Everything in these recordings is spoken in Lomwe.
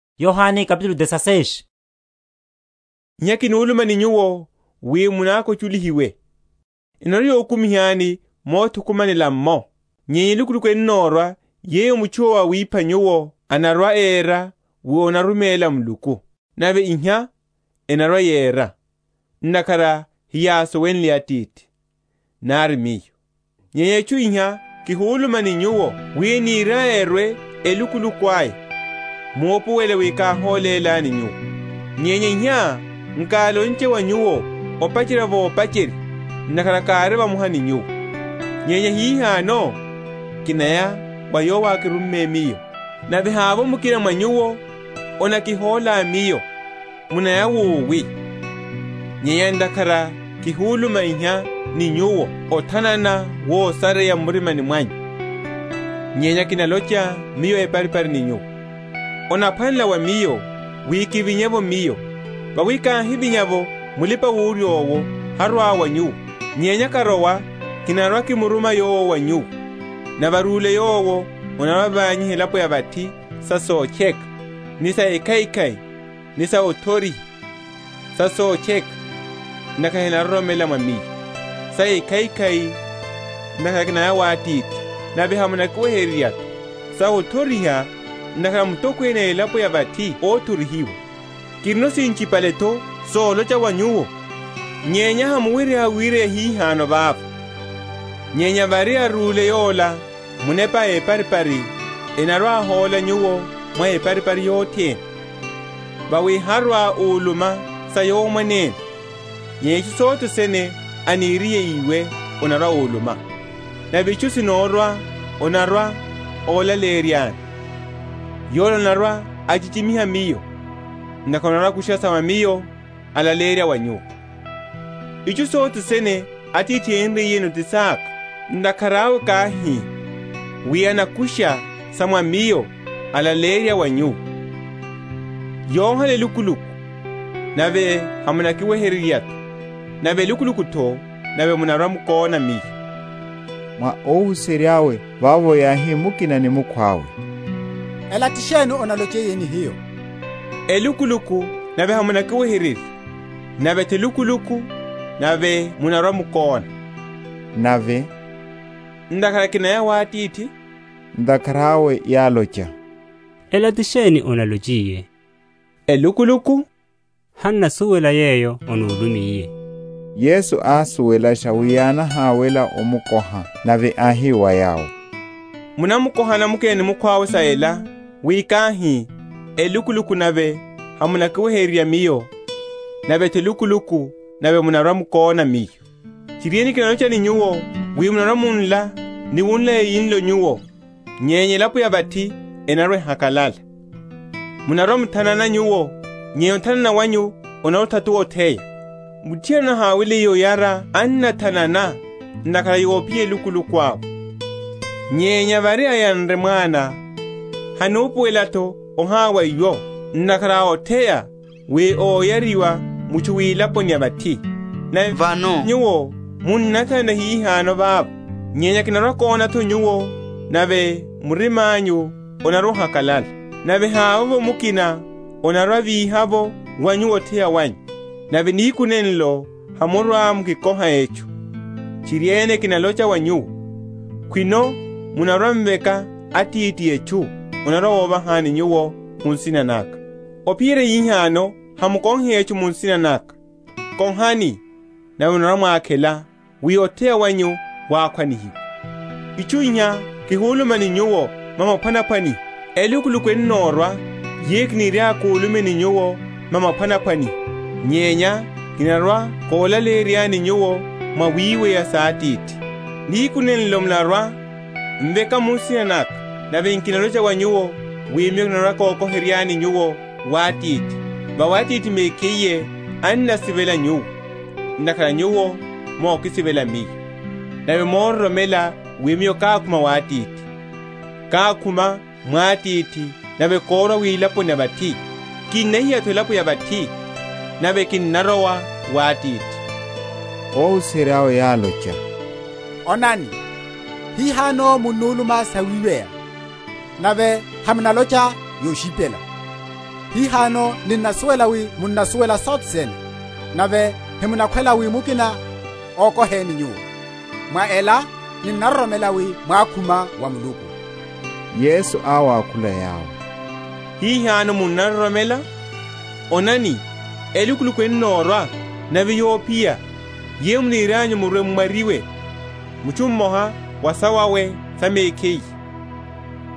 Olakana’tho sa Mulipa‐wurya, Okóka’tho wa Yesu. Iha kihuluma ni nyuwo wi munakwachulihiwe. Enarwa‐yokumihani mothukumanela’mmo; nyenya elukuluku ennorwa yeyo mutchu yowo awipha nyuwo anarwa‐era wi anaruméla Muluku. Nave iha enarwa‐yera, ntakhara heyásuwenle Atithi, nari Miyo. Nyenya itchu iha kihuluma ni nyuwo wi eniryaya erwe elukuluku aya, mupuwele wi káholélani nyuwo. Nyenya iha nkálonche wa nyuwo opacherya vopacherya, ntakhara kári vamoha ni nyuwo. Nyenya hihano kinaya wa Yowo ákirumme Miyo; nave havovo mukina mwa nyuwo anakikoha Miyo, Munaya wowi? Nyenya ntakhara kihuluma iha ni nyuwo othanana wosareya m’murimani mwanyu. Nyenya kinalocha Miyo eparipari ni nyuwo; onaphwanela wa Miyo wi kivinye’vo Miyo; vawi káhivinya’vo, Mulipa‐wurya owo harwa‐arwa wa nyuwo; nyenya karowa kinarwa‐kimuruma Yowo wa nyuwo. Nave arúle Yowo, anarwa‐avanyiha elapo ya vathi sa sotcheka, ni sa ekhaikhai, ni sa othoriha; sa sotcheka, ntakhara henaroromela mwa Miyo: sa ekhaikhai, ntakhara kinaya wa Atithi, nave hamunakiweherya’tho: sa othoriha, ntakhara mutokwene a elapo ela ya vathi óthorihiwa. Kirino sinchipale’tho solocha wa nyuwo, nyenya hamuwerya wireya hihano vava. Nyenya vári arúle Yola, Munepa a eparipari, anarwa‐ahóla nyuwo mwa eparipari yothene: vawi harwa‐uluma sa Yowo mwanene; nyenya itchu sothe sene aniriye íwe, anarwa‐uluma: nave itchu sinorwa anarwa‐olaleyeryani. Yola anarwa‐achichimiha Miyo; ntakhara anarwa‐akusha sa mwa Miyo, alaleyerya wa nyuwo. Itchu sothe sene Atithi ariyeno ti saka: ntakhara awe káhi, wi anakusha sa mwa Miyo alaleyerya wa nyuwo. Yohala elukuluku, nave hamunakiweherya’tho, nave elukuluku’tho, nave munarwa‐mukóna Miyo. Mwa óhuserya’we vavo yáhi mukina ni mukhwawe, Ela ti sheni analochiye ni hiyo, Elukuluku nave hamunakiweherya; nave’tho elukuluku, nave munarwa‐mukóna: nave, ntakhara kinaya wa Atithi? Ntakhara awe yálocha, Ela ti sheni analochiye, Elukuluku? Han’nasuwela yeyo anulumiye. Yesu ásuwelasha wi yánahawela omukoha, nave áhi wa yawo, Munamukohana mukina ni mukhwawe sa ela, wi káhi, Elukuluku nave hamunakiweherya Miyo, nave’tho elukuluku nave munarwa‐mukóna Miyo? Tchiriene, kinalocha ni nyuwo, wi munarwa‐munla ni wunla eyinlo nyuwo, nyenya elapo ya vathi enarwa‐ehakalala; munarwa‐muthanana nyuwo, nyenya othanana wanyu onarwa‐othatuwa otheya. Muthiana anahaweliye oyara annathanana, ntakhara yophiya elukuluku awe; nyenya vári ayanre mwana, hanupuwela’tho ohawa iwo, ntakhara a otheya wi óyariwa mutchu wilaponi ya vathi. Nave vano nyuwo munnathanana hihano vava, nyenya kinarwa‐kóna’tho nyuwo, nave murima’nyu onarwa‐ohakalala, nave havovo mukina anarwa‐avíha’vo wa nyuwo otheya wanyu. Nave nihiku nenlo hamurwa‐mukikoha etchu. Tchiriene, kinalocha wa nyuwo, Khwino mwarwa‐m’veka Atithi etchu, anarwa‐ovahani nyuwo mu nsina naka. Ophiyerya hihano hamukohile etchu mu nsina naka; kohani, nave munarwa‐mwakhela, wi otheya wanyu wakhwanihiwe. Itchu iha kihuluma ni nyuwo mwa maphwanaphwaniho; elukuluku ennorwa yeyo nkirwa‐kuluma ni nyuwo mwa maphwanaphwaniho, nyenya kinarwa‐kolaleyeryani nyuwo mwawiweya sa Atithi. Nihiku nenlo munarwa‐m’veka mu nsina naka: nave nkinalocha wa nyuwo wi Miyo kinarwa‐kokoheryani nyuwo wa Atithi; vawi Atithi mekhiye annasivela nyuwo, ntakhara nyuwo mokisivela Miyo, nave mororomela wi Miyo kákhuma wa Atithi. Kákhuma mwa Atithi, nave kórwa wilaponi ya vathi: kinnahiya’tho elapo ya vathi, nave kinarowa wa Atithi. Óhuserya’we yálocha, Onani, hihano munnuluma sawiweya, nave hamunalocha yoshipela. Hihano ninnasuwela wi munnasuwela sothe sene, nave hamunakhwela wi mukina okoheni Nyuwo; mwa ela ninnaroromela wi mwákhuma wa Muluku. Yesu áwakhula yawo, Hihano munnaroromela? Onani elukuluku ennorwa, nave yophiya, yeyo munirianyu murwe‐m’mwaryiwe, mutchu mmoha wa sawawe sa mekhiye,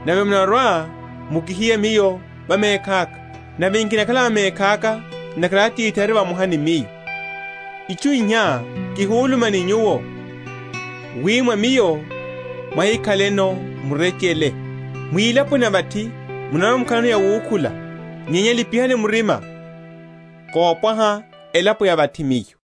nave munarwa‐mukihiya Miyo va mekhaka. Nave nkinakhala va mekhaka, ntakhara Atithi ari vamoha ni Miyo. Itchu iha kihuluma ni nyuwo, wi mwa Miyo mwahikhaleno murechele. Mwilaponi ya vathi munarwa‐mukhalano yawukhula, nyenya lipihani murima, kopwaha elapo ya vathi Miyo.